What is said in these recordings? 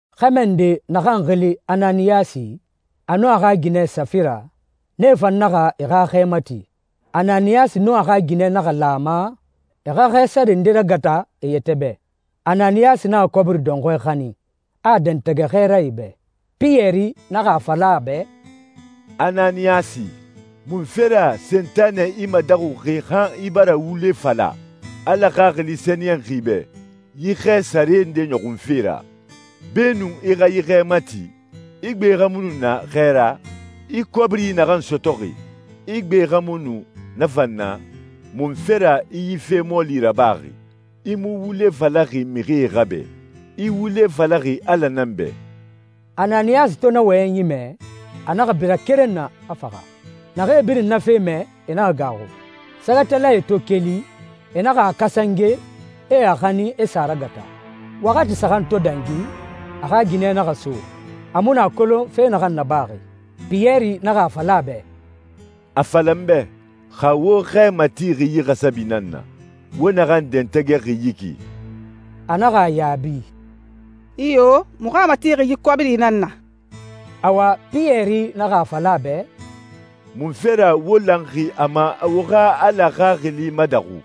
Xɛmɛ nde naxan xili Ananiyasi, a nun a xa ginɛ Safira, nee fan naxa e xa xɛ mati. Ananiyasi nun a xa ginɛ naxa lan a ma e xa xɛ sare nde ragata e yɛtɛ bɛ. Ananiyasi naxa kɔbiri dɔnxɔɛ xanin, a a dɛntɛgɛ xɛɛrae bɛ. Piyɛri naxa a fala a bɛ, «Ananiyasi, munfe ra Sentanɛ i madaxuxi han i bara wule fala Ala Xaxili Sɛniyɛnxi bɛ yi xɛ sare nde nɔxunfe ra? Beenun i xa yi xɛ mati, i gbe xa mu nu na xɛ ra? I kɔbiri naxan sɔtɔxi, i gbe xa mu nu na fan na? Munfe ra i yi fe mɔɔli rabaxi? I mu wule falaxi mixie xa bɛ, i wule falaxi Ala nan bɛ.» Ananiyasi to na wɔyɛnyi mɛ, a naxa bira keren na, a faxa. Naxee birin na fe mɛ, e naxa gaaxu. Sɛgɛtalae to keli, e naxa a kasange, e a xanin, e sa a ragata. Waxati saxan to dangi, a xa ginɛ naxa so, a mu nu a kolon fe naxan nabaxi. Piyɛri naxa a fala a bɛ, «A fala n bɛ, xa wo xɛ matixi yi xasabi nan na, wo naxan dɛntɛgɛxi yi ki?» A naxa a yaabi, «Iyo, muxu a matixi yi kɔbiri nan na.» Awa, Piyɛri naxa a fala a bɛ, «Munfe ra wo lanxi a ma wo xa Ala Xaxili madaxu?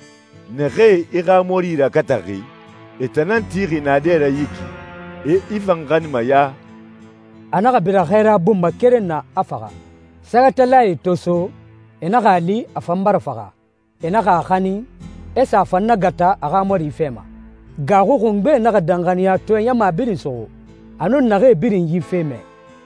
Naxee i xa mɔri ragataxi, e tan nan tixi naadɛ ra yi ki, e i fan xaninma ya.» A naxa bira xɛɛra bun ma keren na, a faxa. Sɛgɛtalae to so, e naxa a li a fan bara faxa. E naxa a xanin, e sa a fan nagata a xa mɔri fɛ ma. Gaaxui xungbe naxa danxaniyatɔɛ ɲama birin suxu, a nun naxee birin yi fe mɛ.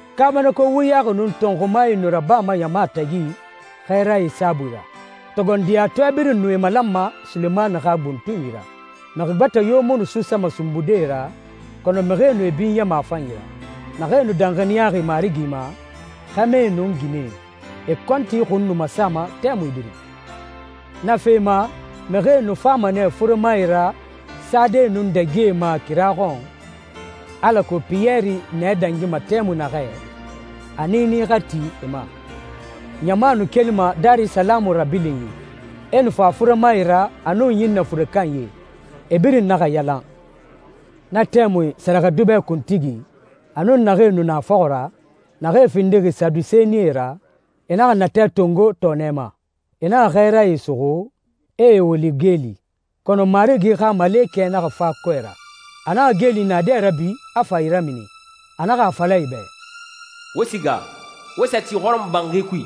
Kaabanako wuyaxi nun tɔnxumae nu rabama ɲama tagi xɛɛrae saabui ra. Togondiyatɔɛ birin nu e malanma Sulemani xa buntunyi ra. Mixi gbɛtɛ yo mu nu suusama sunbude e ra, kɔnɔ mixie nu e binyama a fanyi ra. Naxee nu danxaniyaxi Marigi ma, xɛmɛe nun ginɛe, e kɔnti xun nu masama tɛmui birin. Na fee ma, mixie nu fama nɛ furemae ra sade nun dagie ma kira xɔn, alako Piyɛri nɛ dangima tɛmui naxɛ, a niini xa ti e ma. Ɲama nu kelima Darisalamu rabilinyi, e nu fa furemae ra nun ɲinnɛ fure kanyie. E birin naxa yalan. Na tɛmui sɛrɛxɛdubɛ kuntigi, a nun naxee nu na a fɔxɔ ra, naxee findixi Sadusenie ra, e naxa natɛ tongo tɔɔnɛ ma. E naxa xɛɛrae suxu, e e woli geeli. Kɔnɔ Marigi xa malekɛ naxa fa kɔɛ ra, a naxa geeli naadɛ rabi, a fa e ramini. A naxa a fala e bɛ, «Wo siga, wo sa ti hɔrɔmɔbanxi kui,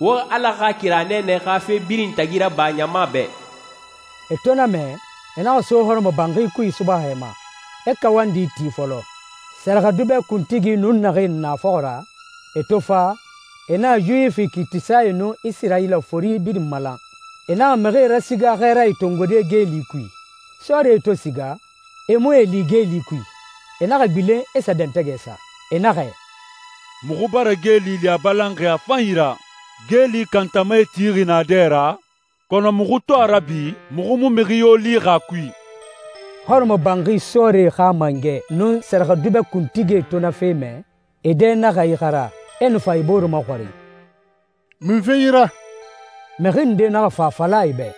wo Ala xa kira nɛɛnɛ xa fe birin tagi raba ɲama bɛ.» E to na mɛ, e naxa so hɔrɔmɔbanxi kui subaxɛ ma, e kawandi ti fɔlɔ. Sɛrɛxɛdubɛ kuntigi nun naxee nu na a fɔxɔ ra, e to fa, e naxa Yuwifi kiitisae nun Isirayila fori birin malan. E naxa mixie rasiga xɛɛrae tongode geeli kui. Sɔrie to siga, e mu e li geeli kui. E naxa gbilen, e sa dɛntɛgɛ sa. E naxɛ, «Muxu bara geeli li a balanxi a fanyi ra, geeli kantamae tixi naadɛ ra, kɔnɔ muxu to a rabi, muxu mu mixi yo lixi a kui.» Hɔrɔmɔbanxi sɔɔrie xa mangɛ nun sɛrɛxɛdubɛ kuntigie to na fe mɛ, e dɛ naxa ixara. E nu fa e bore maxɔrin, «Munfe yi ra?» Mixi nde naxa fa a fala e bɛ,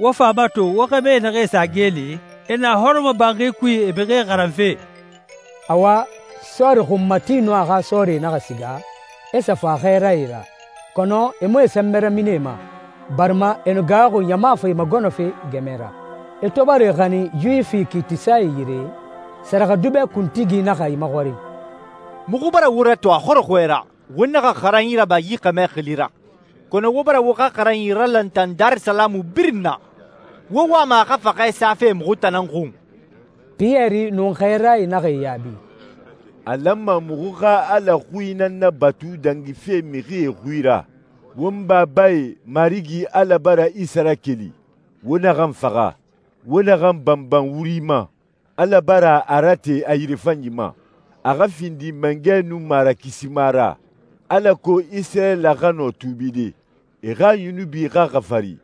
«Wo fa a mato, wo xɛmɛ naxee sa geeli, e na hɔrɔmɔbanxi kui e mixie xaranfe.» Awa, sɔɔri xunmati nun a xa sɔɔrie naxa siga, e sa fa xɛɛrae ra. Kɔnɔ e mu e sɛnbɛ ramini e ma, barima e nu gaaxuxi ɲama fa e magɔnɔfe gɛmɛ ra. E to bara e xanin Yuwifi kiitisae yire, sɛrɛxɛdubɛ kuntigi naxa e maxɔrin, «Muxu bara wo ratɔn a xɔrɔxɔɛ ra, wo naxa xaranyi raba yi xɛmɛ xili ra, kɔnɔ wo bara wo xa xaranyi ralantan Darisalamu birin na. Wo wama a xa faxɛ safe muxu tan nan xun!» Piyɛri nun xɛɛrae naxa e yaabi, «A lanma muxu xa Ala xui nan nabatu dangife mixie xui ra. Won babae Marigi Ala bara Isa rakeli, wo naxan faxa, wo naxan banban wuri ma. Ala bara a rate a yirefanyi ma a xa findi Mangɛ nun Marakisima ra, alako Isirayila xa nɔ tuubide, e xa yunubi xa xafari.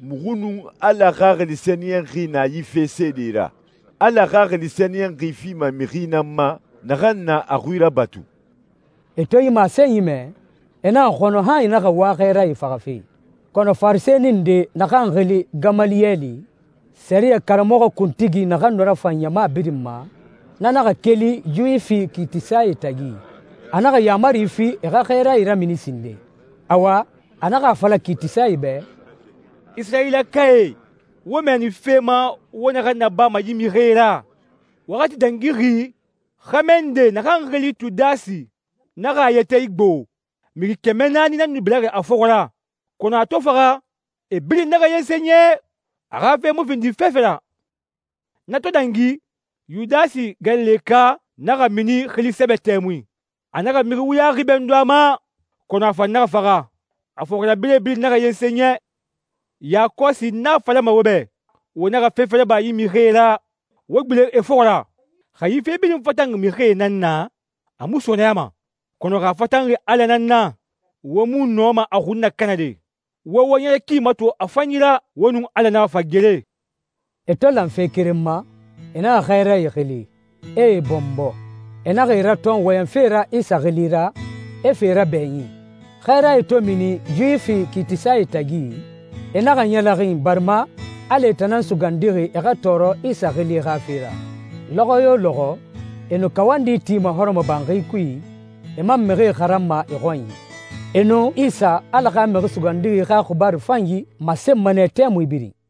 Muxu nun Ala Xaxili Sɛniyɛnxi na yi fe seedee ra. Ala Xaxili Sɛniyɛnxi fima mixi nan ma, naxan na a xui rabatu.» E to yi masenyi mɛ, e naxa xɔnɔ han e naxa wa xɛɛrae faxafe. Kɔnɔ Farisɛni nde naxan xili Gamaliyɛli, sɛriyɛ karamɔxɔ kuntigi naxan nu rafan ɲama birin ma, na naxa keli Yuwifi kiitisae tagi. A naxa yaamari fi e xa xɛɛrae ramini sinden. Awa, a naxa a fala kiitisae bɛ, «Isirayilakae, wo mɛɛni fe ma wo naxan nabama yi mixie ra. Waxati dangixi xɛmɛ nde naxan xili Tudasi naxa a yɛtɛ igbo. Mixi kɛmɛ naani nan nu biraxi a fɔxɔ ra, kɔnɔ a to faxa e birin naxa yensen yɛ. A xa fe mu findi fefe ra.» «Na to dangi, Yudasi Galileka naxa mini xili sɛbɛ tɛmui. A naxa mixi wuyaxi bɛndun a ma, kɔnɔ a fan naxa faxa, a fɔxirabirɛe birin naxa yensen yɛ. Yakɔsi n a falama wo bɛ, wo naxa fefe raba yi mixie ra. Wo gbilen e fɔxɔ ra. Xa yi fe birin fatanxi mixie nan na, a mu sɔɔnɛyama. Kɔnɔ, xa a fatanxi Ala nan na, wo mu nɔma a xun nakanade. Wo wo ɲɛrɛ ki mato a fanyi ra, wo nun Ala naxa fa gere.» E to lan fe keren ma, e naxa xɛɛrae xili, e e bɔnbɔ. E naxa e ratɔn wɔyɛnfe ra Isa xili ra, e fa e rabɛɲin. Xɛɛrae to mini Yuwifi kiitisae tagi, e naxa ɲɛlɛxin barima Ala e tan nan sugandixi, e xa tɔɔrɔ Isa xili xa fe ra. Lɔxɔ yo lɔxɔ, e nu kawandi tima hɔrɔmɔbanxi kui, e man mixie xaranma e xɔnyi. E nu Isa, Ala xa Mixi Sugandixi xa xibaaru fanyi masenma nɛ tɛmui birin.